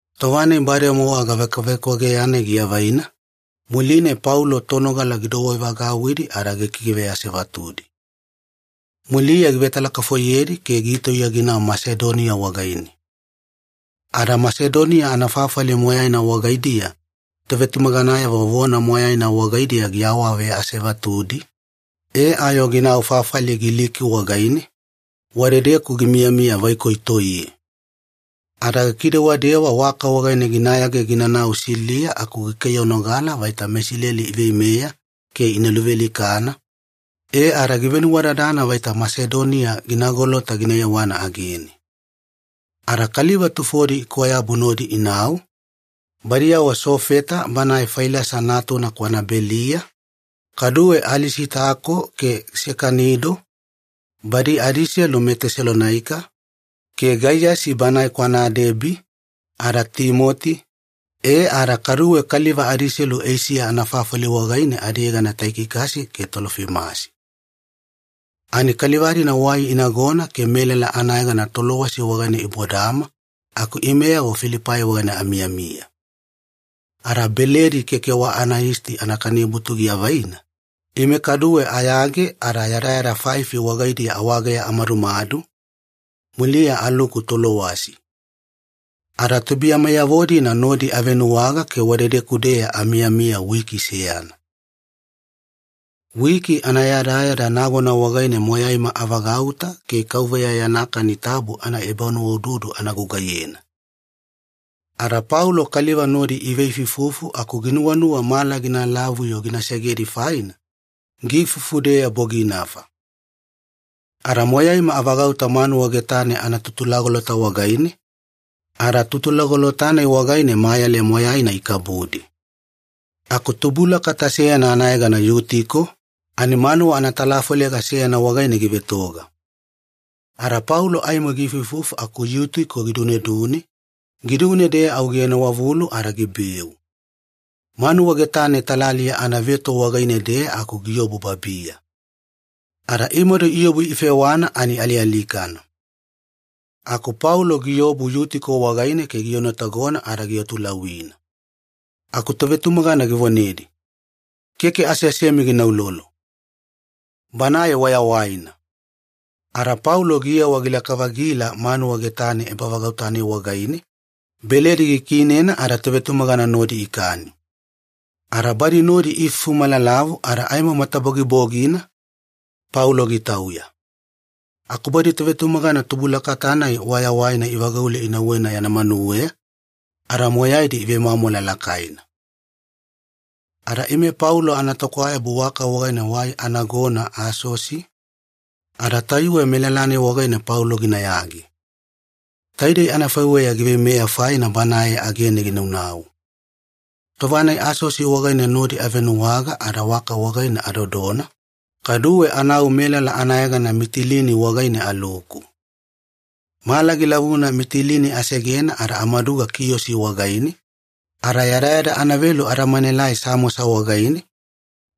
Tova-nai bademowa gavekwavekwageya-nai giavaina, muline Paulo tonogala gidouwevagauwidi ada gikiveasevatudi. Muliya givetalakafoiyedi ke gitauya ginau Masedonia wagaine. Ada Masedonia anafafali moyaina wagaidiya tovetumaganayavo vona moyaina wagaidiya giawaveasevatudi, e ayo ginau fafali Giliki wagaine, wadedeku gimiyamiya vaikoi toiye. Ada gikidewadewa waka wagaine ginayage ginanau Siliya aku gikaiyanogala vaita meIsileli iveimeya ke ina luvealikana, e ada givenuwadadana vaita Masedonia gina golota gina yewana agene. Ada kaliva tufodi ikwayabu nodi inau, badiyavo Sofeta banae Failasa natuna kwana Beliya, kaduwe Alisitako ke Sekanido, badi adiselu meTesalonaika, ke Gaiyasi banae kwana Debi, ada Timoti, e ada kaduwe kaliva adiselu Eisiya anafafali wagaine adiyegana Taikikasi ke Tolofimasi. Ani kaliva-dina wai inagona ke melala anayegana Tolowasi wagaine ibodama aku imeyavo Filipai wagaine amiyamiya. Ada Beledi Keke Wa Anayisti Anakanibutu giavaina, ime kaduwe ayage ada yadayada faifi wagaidiya awageya amadumadu, muliya aluku Tolowasi. Ada tubuiyameyavo-dina nodi avenuwaga ke wadedeku-deya amiyamiya wiki seyana. Wiki anayadayada nagona wagaine moyaima avagauta ke Kauveya Yana Kani Tabu anaebanuwaududu ana gugaiyena. Ada Paulo kaliva nodi iveifuifufu aku ginuwanuwa mala gina lavuna-yo gina segedi faina, giifufu-deya boginafa. Ada moyaima avagauta manuwa getane anatutulagolota wagaine, ada tutulagolota-nai wagaine mayale moyaina ikabudi. Aku tubulakata seyana anayegana Yutiko, ani manuwa anatalafolega seyana wagaine givetoga. Ada Paulo aimo giifuifufu aku Yutiko gidunedune, gidune-deya au gienowavulu ada gibeu. Manuwa getane talaliya anaveto wagaine-deya aku giobu babiya. Ada imadu iobu ifewana ani alialikana. Aku Paulo giobu Yutiko wagaine ke gienotagona ada giatulauwina. Aku tovetumagana givonedi, “Keke aseasemi gina uloulo. Banae wayawaina!” Ada Paulo giyewa gilaka-vagila manuwa getane ebavagauta-nai wagaine, beledi gikiinena ada tovetumagana nodi ikani. Ada badi nodi iifufu malalavu ada aimo matabogibogina, Paulo gitauya. Aku badi tovetumagana tubulakata-nai wayawaina ivagaule inauwena yana manuweya, ada moyaidi ivemwamwala lakaina. Ada ime Paulo anatokwayabu waka wagaine wai anagona Asosi, ada tayuwe melala-nai wagaine Paulo ginayage. Taidei anafaiweya giveimeya faina banae agene ginanau. Tova-nai Asosi wagaine nodi avenuwaga ada waka wagaine adodona, kaduwe anau melala anayegana Mitilini wagaine aluku. Mala gilavuna Mitilini asegena ada amaduga Kiyosi wagaine, ada yadayada anavelu adamanaelai Samosa wagaine,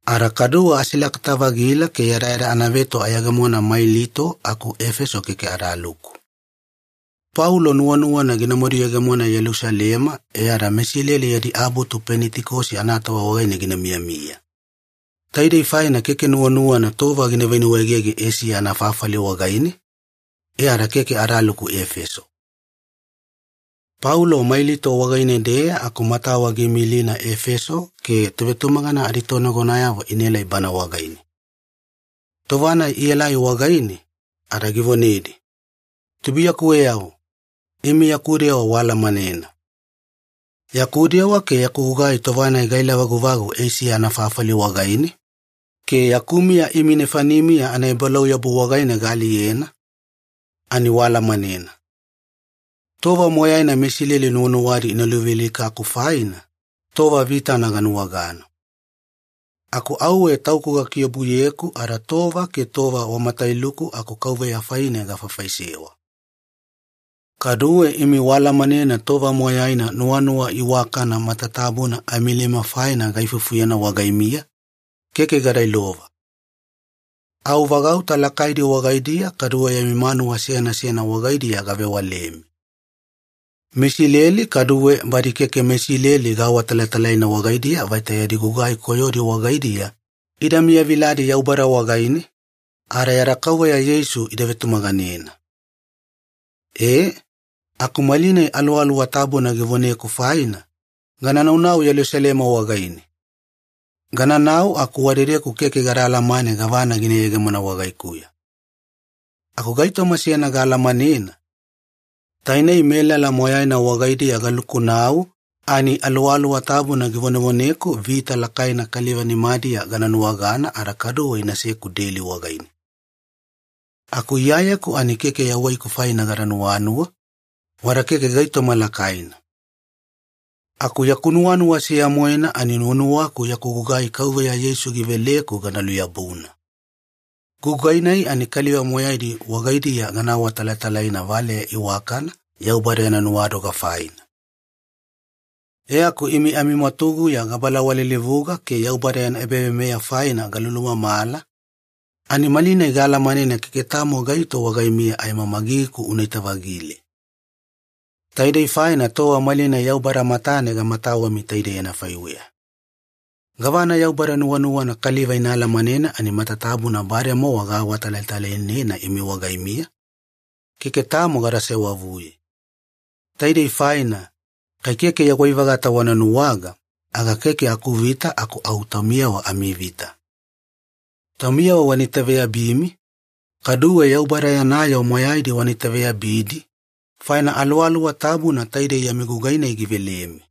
ada kaduwe asilakata-vagila ke yadayada anaveto ayegemona Mailito aku Efeso keke adaluku. Paulo nuwanuwana ginamadu yegemona Yelusalema e ada meIsileli yadi abutu Penitikosi anatova wagaine gina miyamiya. Taidei faina keke nuwanuwana tova gina venuwaegege Eisiya anafafali wagaine, e ada keke adaluku Efeso. Paulo Mailito wagaine-deya aku matawa giimilina Efeso ke tovetumagana aditonagonayavo inaelai bana wagaine. Tova-nai ielai wagaine, ada givonedi, “Tubuiyakuweyavo, imi yaku dewa waalamanena. Yaku dewa ke yaku gugai tova-nai gaela-vaguvagu Eisiya anafafali wagaine, ke yaku miya imi nefanimiya anaebalauyabu wagaine gaaliyena, ani waalamanena. Tova moyaina meIsileli nuwanuwadi ina luvealikaku faina, tova vitana ganuwagana. Aku auwe tauku gakiobuyeku ada tova ke tova wa matailuku aku Kauveya faine gafaifaisewa. Kaduwe imi waalamanena tova moyaina nuwanuwa iwakana matatabuna amilema faina gaifufuyena wagaimiya, keke gada ilova. Au vagauta lakaidi wagaidiya kaduwe yami manuwa seyana seyana wagaidiya gavewalemi. MeIsileli kaduwe badi keke meIsileli gaawatalatalaina wagaidiya vaita yadi gugai koyodi wagaidiya ida miyaviladi Yaubada wagaine, ada yada Kauveya Yeisu ida vetumaganena. “Ee, aku malinai Aluwaluwa Tabuna givoneku faina, gana naunau Yelusalema wagaine. Gananau aku wadedeku keke gada alamane gavana gina yegemona wagaikuya. Aku gaitoma seyana gaalamanena, tainei melala moyaina wagaidiya galukunau ani Aluwaluwa Tabuna givonevoneku vita lakaina kaliva nimadiya gana nuwagana ada kaduwe inaseku deli wagaine. Aku Iyayeku ani keke yawaiku faine gada nuwanuwa, wada keke gaitoma lakaina. Aku yaku nuwanuwa seya-moena ani nuwanuwaku yaku gugai Kauveya Yeisu giveleku gana luyabuna. Gugai-nai ani kaliva moyaidi wagaidiya gana awatalatalaina valeya iwakana Yaubada yana nuwadoga faina. “E aku imi amimwatuguya gabalawalilivuga ke Yaubada yana ebaveimeya faina galulumamala, ani malinai gaalamanena keke tamo gaito wagaimiya aimo magigiku unaita-vagile. Taidei faina tova malinai Yaubada matane gamatawemi taidei anafaiweya. Gavana Yaubada nuwanuwana kaliva ina alamanena ani matatabuna bademowa gaawatalatalainena imi wagaimiya, keke tamo gada sewavuye. Taidei faina, kai keke yawai-vagata wana nuwaga, aga keke akuvita aku au taumiyavo amivita. Taumiyavo wana itaveyabimi, kaduwe Yaubada yana yoo moyaidi wana itaveyabidi, faina Aluwaluwa Tabuna taidei yami gugai-nai givelemi.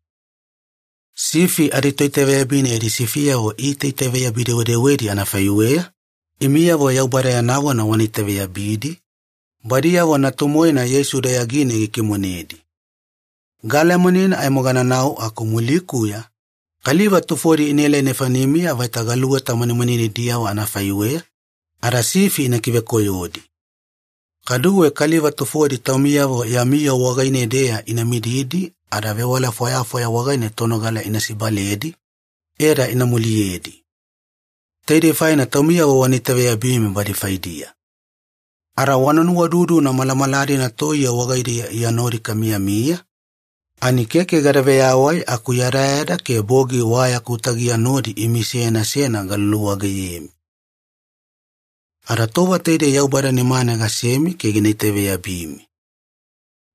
Sifi aditoitaveyabina yadi sifiyavo iitaitaveyabi-dewedewedi anafaiweya, imiyavo Yaubada yana yoo wana itaveyabidi, badiyavo Natu-moena Yeisu dayagine gikimonedi. Gaalamanena aimo gananau, aku mulikuya kaliva tufodi inaelai nefanimiya vaita galuweta manimaninidiyavo anafaiweya, ada sifi ina kivekoyodi. Kaduwe kaliva tufodi taumiyavo yami yoo wagaine-deya ina mididi ada vewala fwayafwaya wagaine tonogala ina sibaledi, e ada ina muliyedi. Taidei faina taumiyavo wana itaveyabimi badi faidiya. Ada wana nuwaududuna malamala-dina toiye wagaidiya Iya nodi kamiyamiya, ani keke gada veyawai aku yadayada ke bogi wa yaku tagiya nodi imi seyana seyana galuluwageyemi. “Ada tova taidei Yaubada nimane gasemi ke gina itaveyabimi.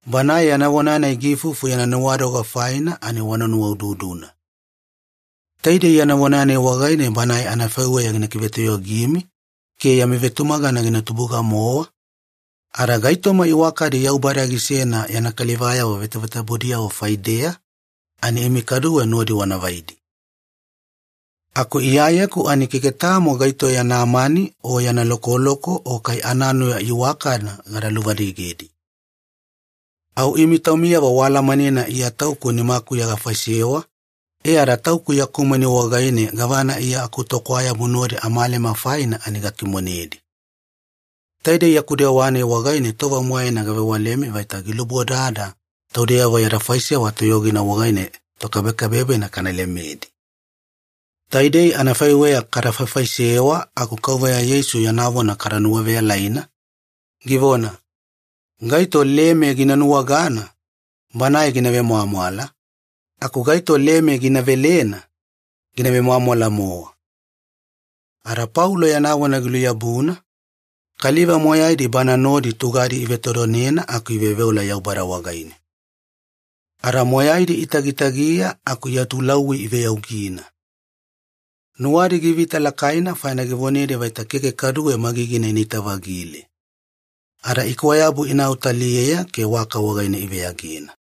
Banae yana vona-nai giifufu yana nuwadoga faina ani wana nuwaududuna. Taidei yana vona-nai wagaine Banae anafaiweya gina kivetoyogimi ke yami vetumagana gina tubuga-mowa, ada gaitoma iwakadi Yaubada gisena yana kalivayavo vetavetabudiyavo faideya ani imi kaduwe nodi wana vaidi. Aku iyayeku ani keke tamo gaito yana mani o yana lokoloko o kai ananuya iwakana gada luvadigedi. Au imi taumiyavo waalamanena Iya tauku nimakuya gafaisewa, e ada tauku yaku mani wagaine gavana Iya akutokwayabu nodi amalema faina ani gakimonedi. Taidei yaku dewa-nai wagaine tova moyaina gavewalemi vaita gilubodada taudeyavo yada faisewa toyogina wagaine tokabekabebena kana lemedi. Taidei anafaiweya kada faifaisewa aku Kauveya Yeisu yana vona kada nuwaveyalaina, givona, ‘Gaito leme gina nuwagana, banae gina vemwamwala, aku gaito leme gina velena, gina vemwamwala-mowa.’” Ada Paulo yana vona giluyabuna, kaliva moyaidi bana nodi tugadi ivetodonena aku iveoveola Yaubada wagaine. Ada moyaidi itagitagiya aku iatulauwi iveyaugina. Nuwadi givita lakaina faina givonedi vaita keke kaduwe magigina inaita-vagile. Ada ikwayabu inau taliyeya ke waka wagaine iveyagena.